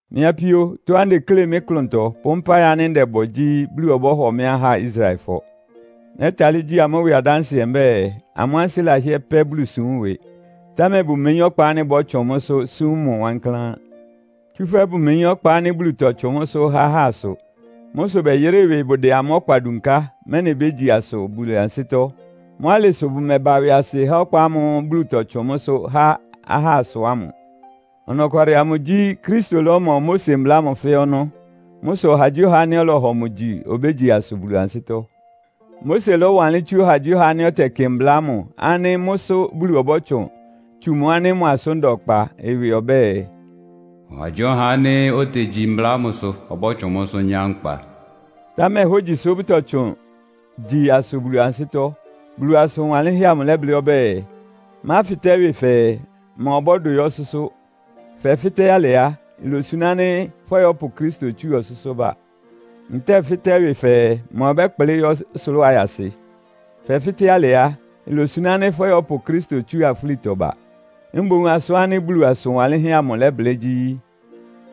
Mɩ́ apíó, tɔ́á ntekle mɩ́ klʋntɔ, pʋ́ mpáɩ ánɩ́ ndɛbɔ gyí, Bulu ɔbɔ́hɔ mɩ́ ahá Israelfɔ. Nɛ́talɩ́ gyi amʋ́ ɩwɩ adánsɩɛ mbɛ́ɛ, amʋ́ ansɩ́ lahɩ́ɛ́ pɛ́ Bulusúm ɩwɩ, támɛ bʋmeyín ɔkpa ánɩ́ bɔ́tsʋn mʋ́sʋ́ súm mʋ wankláán. Tsúfɛ́ bʋmeyín ɔkpa ánɩ́ Bulu tɔtsʋn mʋ́sʋ́ há ahá asʋ. Mʋ́ sʋ bɛyɩrɩ́ ɩwɩ bʋdɛ amʋ́ ɔkpa dunká, mɛ́nɩ bégyi asʋ Bulu ansɩ́tɔ́. Mʋ́ alɩ sʋ bʋmɛba ɩwɩasɩ há ɔkpa ámʋ́ʋ́ Bulu tɔtsʋn mʋ́sʋ́ há ahá asʋ ámʋ. Ɔnɔkwalɩ amʋ gyí, Kristo lɔ́mɔ Mose Mbla ámʋ fɛ́ɛ́ ɔnɔ́. Mʋ́ sʋ ɔhagyíɔha ánɩ́ ɔlɔhɔ mʋ gyi obégyi asʋ Bulu ansɩ́tɔ́. Mose lɔ́wanlɩ́n tsú ɔhagyíɔha ánɩ́ ɔtɛkɩ mbla ámʋ ánɩ́ mʋ́sʋ́ Bulu ɔbɔ́tsʋn tsu mʋ ánɩ́ mʋ asʋ́n da ɔkpa ɩwɩ ɔbɛ́ɛ, “Ɔhagyíɔha ánɩ́ otegyi mbla ámʋsʋ ɔbɔ́tsʋn mʋ́sʋ́ nyá nkpa.” Támɛ hógyisʋ bʋtɔtsʋn gyi asʋ Bulu ansɩ́tɔ́. Bulu asʋn wanlɩ́nhɛ́ amʋ lɛ́blɩ́ ɔbɛ́ɛ, “Máfɩtɛ́ ɩwɩ fɛɛ, ‘Ma ɔbɔ́dʋ yɔ́ ɔsʋ́sʋ́?’” (Fɛfɩ́tɛ́ alɩ á, ilosuná ánɩ́ fɔ́yɔpʋ Kristo tsúa ɔsʋ́sʋ́ ba.) Ntɛ́ɛ fɩ́tɛ́ ɩwɩ fɛɛ, “Ma ɔbɛ́kplɩ́ yɔ́ ɔsʋlʋ́ʋ ayasɩ?” (Fɛfɩ́tɛ́ alɩ á, ilosuná ánɩ́ fɔ́yɔpʋ Kristo tsúa afúlitɔ ba.) Mboún asʋ́n ánɩ́ Bulu asʋn wanlɩ́nhɛ́ amʋ lɛ́blɩ́ gyí,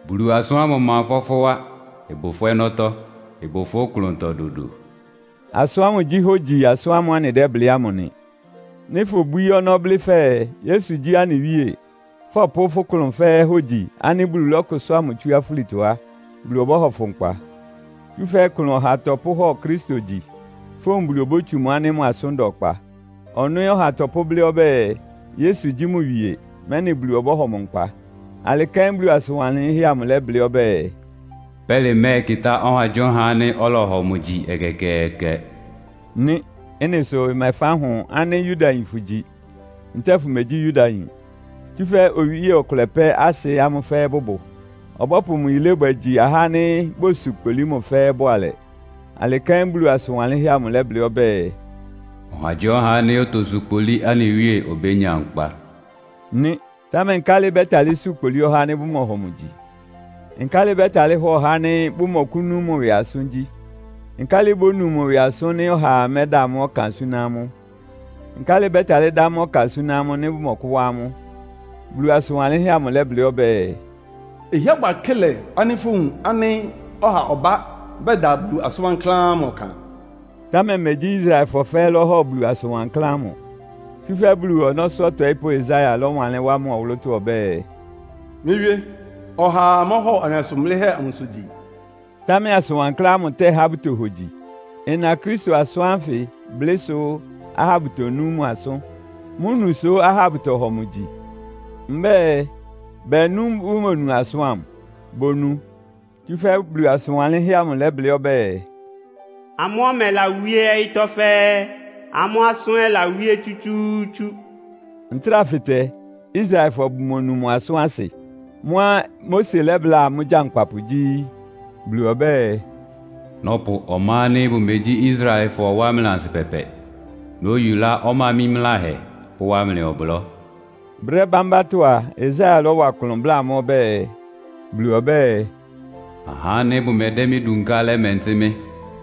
“Bulu asʋ́n ámʋ ɩma ɩfɔ́ fʋ́ wá. Ɩbʋ fʋ́ ɔnɔ́tɔ́, ɩbʋ fʋ́ klʋntɔ dodo.” Asʋ́n ámʋ gyí hógyi asʋ́n ámʋ́ʋ́ anɩdɛ́blɩ́ ámʋ nɩ. Nɩ́ fobwíí ɔnɔ́ blɩ́ fɛɛ, “Yesu gyí anɩ Wíe,” fɔpʋ́ fʋ́ klʋn fɛ́ɛ́ hogyi ánɩ́ Bulu lɔ́kʋsʋ́a mʋ tsú afúlitɔ á, Bulu ɔbɔ́hɔ fʋ nkpa. Tsúfɛ́ ɩklʋn ɔha tɔpʋ́hɔ Kristo gyi. Fówun Bulu obótsu mʋ ánɩ́ mʋ asʋ́n da ɔkpa. Ɔnɔ́ ɛ́ ɔha tɔpʋ́blɩ́ ɔbɛ́ɛ, Yesu gyí mʋ wie, mɛ́nɩ Bulu ɔbɔ́hɔ mʋ nkpa. Alɩ kɛ́n Bulu asʋn wanlɩ́nhɛ́ amʋ lɛ́blɩ́ ɔbɛ́ɛ, “Pɛ́lɩ mɛ́ɛkɩtá ɔhagyíɔha ánɩ́ ɔlɔhɔ mʋ gyi ɛkɛkɛɛkɛ” nɩ́. Ɩ́nɩ sʋ ɩmɛfáhʋn ánɩ́ Yudayin fʋgyi, ntɛ́ɛ fʋmegyí Yudayin. Tsúfɛ́ owíe ɔkʋlɛ pɛ́ asɩ amʋ́ fɛ́ɛ́ bʋbʋ. Ɔbɔ́pʋ mʋ yilébwɛ gyi ahá ánɩ́ bosu kpolí mʋ fɛ́ɛ́ bʋalɛ. Alɩ kɛ́n Bulu asʋn wanlɩ́nhɛ́ amʋ lɛ́blɩ́ ɔbɛ́ɛ, “Ɔhagyíɔha ánɩ́ otosu kpolí anɩ Wíe obénya nkpa” nɩ́. Támɛ nkálɩ bɛ́talɩ́ su kpolí ɔhá ánɩ́ bʋmɔhɔ mʋ gyi? Nkálɩ bɛ́talɩ́ hɔ ɔhá ánɩ́ bʋmɔkʋ́nú mʋ ɩwɩ asʋ́n gyí? Nkálɩ bónu mʋ ɩwɩ asʋ́n nɩ́ ɔhaa mɛ́da mʋ́ ɔkan súná amʋ́? Nkálɩ bɛ́talɩ́ dá mʋ́ ɔkan súná amʋ́, nɩ́ bʋmɔkʋ́wá amʋ́? Bulu asʋn wanlɩ́nhɛ́ amʋ lɛ́blɩ́ ɔbɛ́ɛ, “Ɩhɩ́ɛ́ bʋ akɩ́lɛ ánɩ́ fówun ánɩ́ ɔha ɔbá bɛda Bulu asʋn wankláán ɔkan!” Támɛ megyí Israelfɔ fɛ́ɛ́ lɔ́hɔ Bulu asʋn wankláán ámʋ. Tsúfɛ́ Bulu ɔnɔ́sʋ́ ɔtɔɩ́pʋ́ Yesaia lɔ́wanlɩ́n wá mʋ ɔwʋlʋ́tɔ́ ɔbɛ́ɛ, “Mɩ́ Wíé, ɔhaa mɔ́hɔ anɩ asʋn blɩ́hɛ́ amʋsʋ gyi.” Támɛ asʋn wankláán ámʋ tɛ́há bʋtohogyi. Ɩna Kristo asʋ́n ánfɩ blɩ́sʋ́ ahá bʋtonú mʋ asʋ́n. Mʋ́ nu sʋ́ ahá bʋtɔhɔ mʋ gyi. Mbɛ́ɛ, bɛɛ nú bʋmonu asʋ́n ámʋ? Bonu! Tsúfɛ́ Bulu asʋn wanlɩ́nhɛ́ amʋ lɛ́blɩ́ ɔbɛ́ɛ, “Amʋ́ ɔmɛ lawíé ɔyɩ́tɔ́ fɛ́ɛ́, ámʋ́ asʋ́n ɛ́ lawíé tsútsúútsú.” Ntráa fɩtɛ. Israelfɔ bʋmonu mʋ asʋ́n asɩ? Mʋ́á Mose lɛ́bláa amʋ́ gyankpapʋ gyí, “Bulu ɔbɛ́ɛ, ‘Nɔ́pʋ ɔmá ánɩ́ bʋmegyí Israelfɔ wá mlɩ ansɩpɛpɛ. Nóyulá ɔmá mímláhɛ pʋ́wá mlɩ ɔblɔ́.’” Brɛ́ bámbátɔ́ a, Yesaia lɔ́wa klʋn bláa amʋ́ ɔbɛ́ɛ, “Bulu ɔbɛ́ɛ, ‘Ahá ánɩ́ bʋmɛdɛ́ mɩ́ dunká lɛ́mɛntɩ́ mɩ́.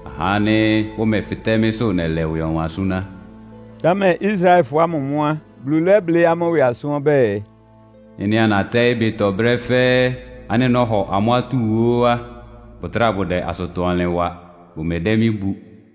Ahá ánɩ́ bʋmɛfɩtɛ́ mɩ́sʋ́ nɛlɛ ɩwɩ ɔwan súná.’” Támɛ Israelfɔ ámʋ mʋ́ á, Bulu lɛ́blɩ́ amʋ́ ɩwɩ asʋ́n ɔbɛ́ɛ, “Ɩ́nɩá natɛ́ɩ́ ɩbɩtɔ brɛ́ fɛ́ɛ́ ánɩ́ nɔ́hɔ amʋ́ atúu ó á, bʋtráa bʋdɛ asʋtɔ-ɔnlɩn wa. Bʋmɛdɛ́ mɩ́ bu.”